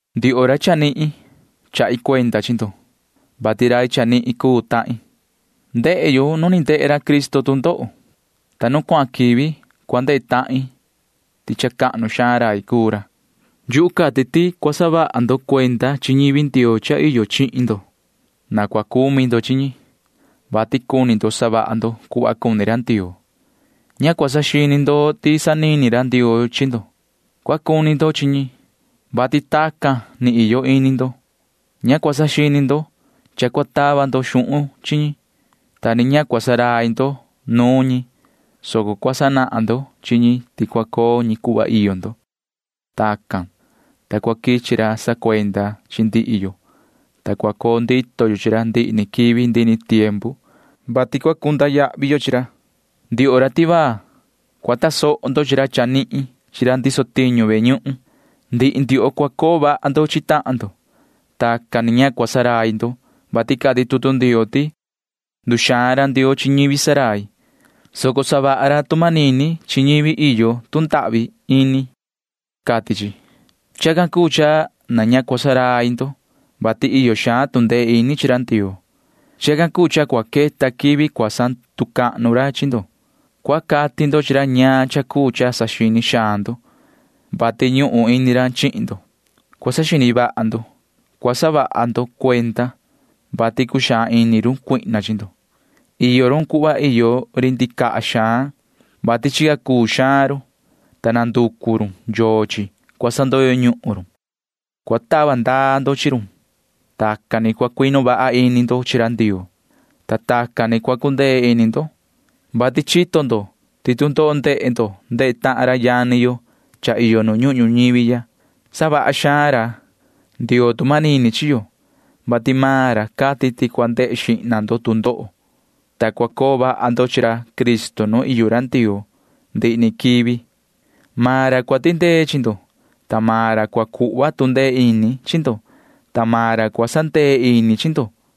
Ndioho ra chanihin, chahi cuenda chi ndo, vati rai chanihin cuu tahin. Ndehe tahin nuun cha ni ndehe ra Cristo tu ndoho, ta nu cuahan quivi cua ndehe tahin ti cha cahnu xaan rai cuu ra. Yuhu cati ti cua saha vaha ndo cuenda chi ñivi Ndioo cha iyo chihin ndo. Na cua cumi tahan ndo chi ñi, vati cuni ndo savaha ndo cuhva cuni ra Ndioo. Ña cua saxini ndo ti sanini ra Ndioo chi ndo. Cua cuni ndo chi ñi, vati tacan ni cha iyo ini ndo. Ña cua saxini ndo cha cua tava ndo xuhun chi ñi, ta ni ña cua ndurai ndo nuun ñi, soco cua sanahan ndo chi ñi ti cua coo maan ñi cuhva iyo ndo. Tacan, ta cua quichi ra sacuenda chi ndihi yo, ta cua coo ndito yo chi ra ndihi ni quivi ndihi ni tiempu, vati cua cunda yahvi yo chihin ra. Ndioho ra tivaa, cua tasoho ndo chi ra chanihin chi ra ndiso tiñu ve ñuhun. Ndihi ndioho cua coo vaha ndo chi tahan ndo. Tacan ni ña cua ndurai ndo, vati cati tutu Ndioo ti: Nduxaan ra Ndioo chi ñivi ndurai, soco savaha ra tu manini chi ñivi iyo tu ndahvi ini, cati chi. Chacan cuu cha na ña cua ndurai ndo, vati iyo xaan tu ndee ini chi ra Ndioo. Chacan cuu cha cua queta quivi cha cahnu xaan ñivi cua cuu ndo. Cua cati ndo chi ra ñaan cha cuu cha saxini xaan ndo, vati ñuhun ini ra chihin ndo. Cua saxini vaha ndo. Cua saha ndo cuenda, vati cuxaan ini run cuihna chi ndo. Iyo run cuhva iyo ri ndicaha xaan, vati chica cuu xaan run, ta nanducu run yochi cua sandoyo ñuhun run. Cua tava ndaa ndo chi run. Tacan ni cua cuinu vaha ini ndo chi ra Ndioo, ta tacan ni cua cundee ini ndo, vati chito ndo ti ini tu ndoho ndehe ndo cha ndehe tahan ra yani yo cha iyo nu ñuhun ñuñivi ya. Savaha xaan ra Ndioo tu manini chi yo, vati maan ra cati ti cua ndehe xihna ndo tu ndoho suhva, ta cua coo vaha ndo chi ra Cristo nu iyo ra Ndioo ndihi ni quivi. Maan ra cua tindee chi ndo, ta maan ra cua cuhva tu ndee ini chi ndo, ta maan ra cua sandee ini chi ndo.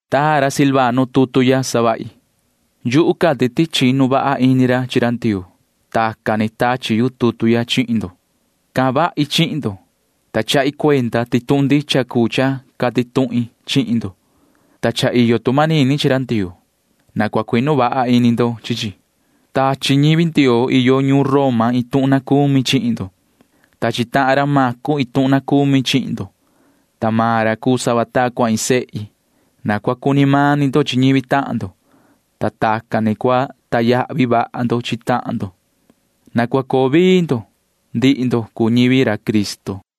Taa ra Silvano tutu ya savahi. Yuhu cati ti chinu vaha ini ra chi ra Ndioo. Tacan ni tachi yu tutu ya chihin ndo. Cahan vahi chihin ndo, ta chahi cuenda ti tuhun ndicha cuu cha cati tuhin chihin ndo, ta cha iyo tu manini chi ra Ndioo. Na cua cuinu vaha ini ndo chi chi. Tachi ñivi Ndioo iyo ñuun Roma iin tuhun na cumi chihin ndo. Tachi tahan ra Macu iin tuhun na cumi chihin ndo, ta maan ra cuu sava ta cua iin sehi. Na cua cuni mani ndo chi ñivi tahan ndo, ta tacan ni cua sacahnu vaha ndo chi tahan ndo. Na cua coo vii ndo―ndihi ndo cuu ñivi ra Cristo.